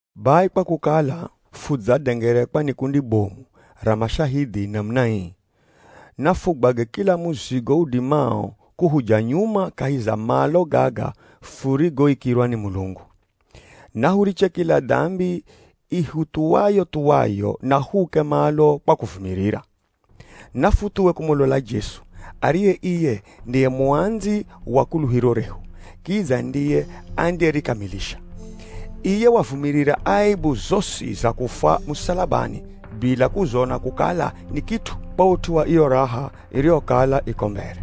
Bai kwa kukala fudzadengerekwa ni kundi bomu ra mashahidhi namuna ii, nafugwage kila muzigo udimao kuhuja nyuma kahi za malo gaga furigoikirwa ni Mulungu. Nahuriche kila dambi ihuthuwayo-thuwayo na huuke malo kwa kuvumirira. Nafuthuwe kumulola Jesu, ariye iye ndiye muandzi wa kuluhiro rehu, kidza ndiye andiyerikamilisha. Iye wavumirira aebu zosi za kufwa musalabani bila kuzona kukala ni kit'u, kwa ut'u wa iyo raha iriyokala iko mbere.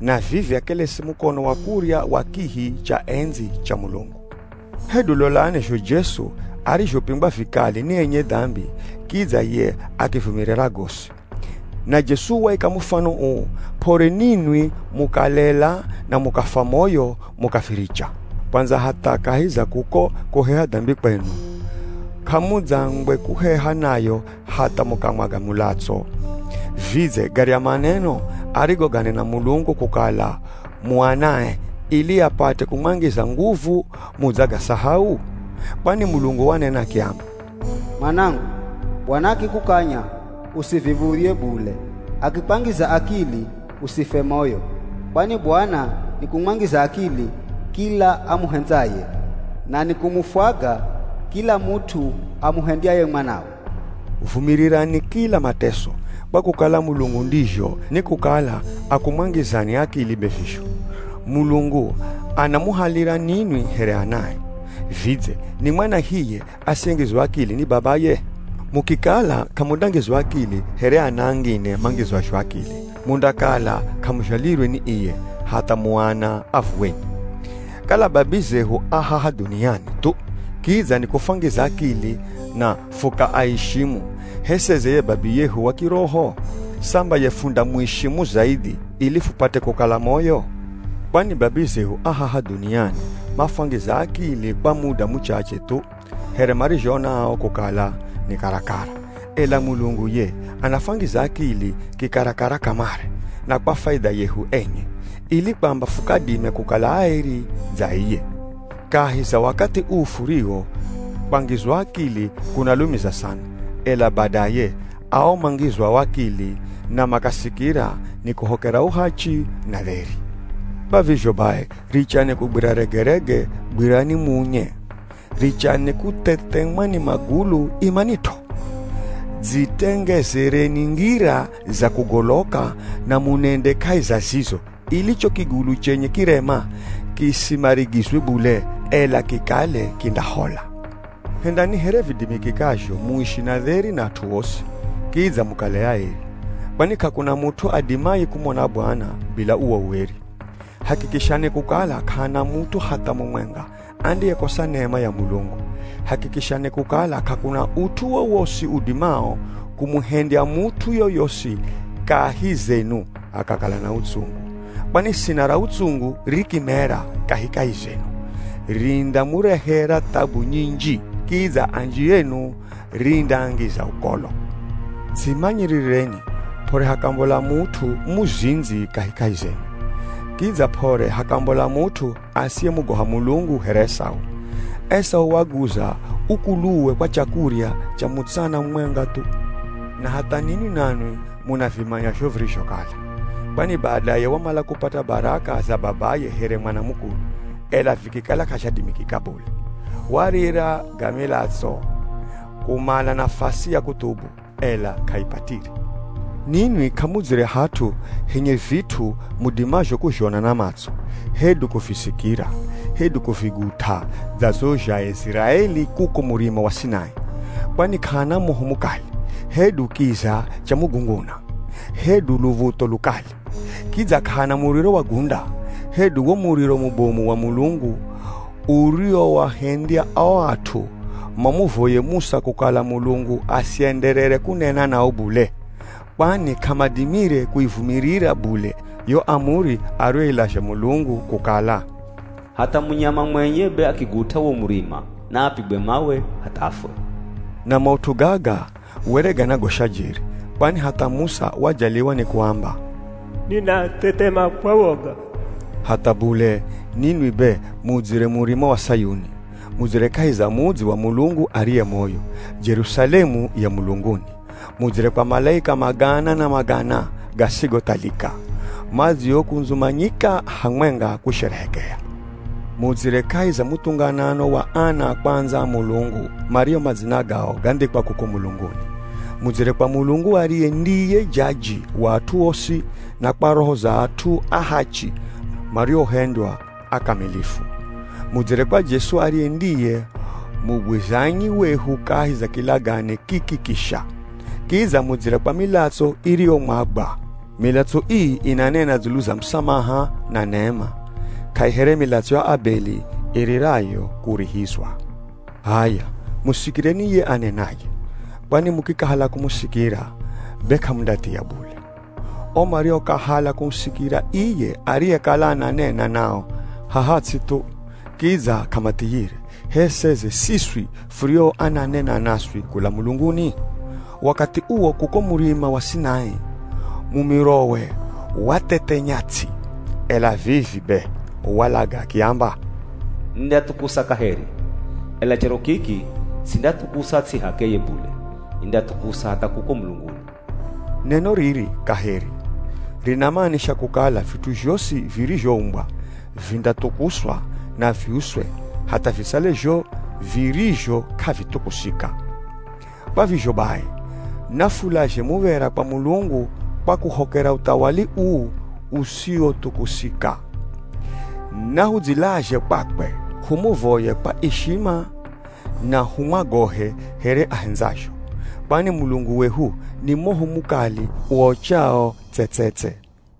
Na vivi akelesi mukono wa kurya wa kihi cha endzi cha Mulungu. Hedu lolani zho Jesu arizhopingwa vikali ni enye dambi kidza ye akivumirira gosi. Na Jesu waika mufano uu p'ore ninwi mukalela na mukafwa moyo mukaviricha. Kwandza hatha kahi za kuko kuheha dambi kwenu, k'amudzangwe kuheha nayo hatha mukamwaga mulatso. Vidze garya maneno arigoganena Mulungu kukala mu anae, ili apate kumwangiza nguvu mudzagasahau? Kwani Mulungu wanena akiamba, “Mwanangu, Bwana akikukanya usiviv̱udhye bule, akikwangiza akili, usifwe moyo. Kwani Bwana ni kumwangiza akili, kila amuhendzaye, na ni kumufwaga kila mut'u amuhendyaye mwanawe.” Vumirirani kila mateso, kwa kukala Mulungu ndizho nikukala akumwangizani akili be vizho. Mulungu anamuhalira ninwi here anae. Vidze, ni mwana hiye asiyengizwa akili ni babaye? Mukikala k'amundangizwa akili here ana angine mangizwazho akili, mundakala k'amuzhalirwe ni iye, hatha mu ana a vuweni. Kala babizehu a haha dhuniani thu kidza nikufwangiza akili na fukaaishimu, h'e seze ye Babiyehu wa kiroho? Samba ye fundamuishimu zaidhi ili fupate kukala moyo? Kwani babizehu a haha dhuniani mafwangiza akili kwa muda muchache thu, here marizhoona ao kukala ni karakara, ela Mulungu ye anafwangiza akili kikarakara kamare, na kwa faidha yehu enye, ili kwamba fukadime kukala aeri dza iye. Kahi za wakathi uu furiwo, kwangizwa akili kunalumiza sana, ela badaye ao mangizwao akili na makasikira, nikuhokera uhachi, na dheri. Kwa vizho bai, richani kugwira regerege, gwirani muunye. Richani kuthethemwa ni magulu, imanit'o. Dzitengezereni ngira za kugoloka na munende kahi za zizo, ili cho kigulu chenye kirema kisimarigizwe bule, ela kikale kindahola. Hendani here vidimikikazho muishi na dheri na at'u osi, kidza mukale aeri. Kwani k'akuna mut'u adimaye kumona Bwana, bila uwo ueri. Hakikishani kukala k'ahana mut'u hatha mumwenga andiyekosa nema ya Mulungu. Hakikishani kukala k'akuna ut'u wowosi udimao kumuhendya mut'u yoyosi kahi zenu akakala na utsungu. Kwani sina ra utsungu rikimera kahikahi zenu, rindamurehera thabu nyinji, kidza anji enu rindaangiza ukolo. Dzimanyirireni p'ore hakambola mut'u muzindzi kahikahi zenu. Kidza p'ore hakambola mut'u asiyemugoha Mulungu here Esau. Esau waguza ukuluwe kwa chakurya cha mutsana mumwenga thu. Na hatha ninwi nanwi munavimanya zho virizhokala. Kwani badaye wamala kupata baraka za babaye here mwana mukulu, ela vikikala k'azhadimikika bule. Warira ga milatso kumala nafasi ya kuthubu, ela k'aipatire. Ninwi k'amudzire hat'u henye vit'u mudimazho kuzhona na matso, hedu kuvisikira, hedu kuvigut'a dza zho zha Aiziraeli kuko Murima wa Sinai. Kwani k'ahana moho mukali, hedu kiza cha mugunguna, hedu luv̱utho lukali. Kidza k'ahana muriro wa gunda, hedu wo mumiro mubomu wa Mulungu uriwoahendya o at'u mamuvoye Musa kukala Mulungu asienderere kunena nao bule. Kwani k'amadimire kuivumirira bule yo amuri ariyoilazha Mulungu kukala, “Hatha munyama mwenye be akigut'a wo murima naapigwe mawe hatha afwe.” Na maut'u gaga were ganagosha jeri, kwani hatha Musa wajaliwa ni kuamba, “Ninathethema kwa woga.” Hatha bule, ninwi be mudzire Murima wa Sayuni. Mudzire kahi za mudzi wa Mulungu ariye moyo, Jerusalemu ya mulunguni. Mudzire kwa malaika magana na magana gasigothalika, madziokundzumanyika hamwenga kusherehekea. Mudzire kahi za muthunganano wa ana a kwandza a Mulungu mario madzina gao gandhikwa kuko mulunguni. Mudzire kwa Mulungu ariye ndiye jaji wa at'u osi, na kwa roho za at'u ahachi mariohendywa akamilifu. Mudzire kwa Jesu ariye ndiye mugwizanyi wehu kahi za kilagane kiki kisha. Kidza mudzire kwa milatso iriyomwagwa. Milatso ii inanena dzulu za musamaha na nema, k'aihere milatso ya Abeli iririrayo kurihizwa. H'aya, musikireni ye anenaye. Kwani mukikahala kumusikira, be k'amundathia bule. O mariokahala kumusikira iye ariyekala ananena nao haha ts'i thu kidza k'amathiyire, h'e seze siswi furio ananena naswi kula mulunguni? Wakathi uwo kuko Murima wa Sinai, mumirowe wathethenya ts'i. Ela vivi be walaga akiamba, “Nindathukusa kaheri, ela charo kiki sindathukusa ts'i h'akeye bule, nindathukusa hatha kuko mulunguni.” Neno riri, “kaheri” rinamanisha kukala vit'u zhosi virizhoumbwa, vindathukuswa na viuswe hatha visale zho virizho k'avithukusika. Kwa vizho bai, nafulazhe muv̱era kwa Mulungu kwa kuhokera uthawali uu usiwothukusika. Nahudzilazhe kwakwe humuvoye kwa ishima na humwagohe, here ahendzazho. Kwani Mulungu wehu ni moho mukali uochawo tse-tse-tse.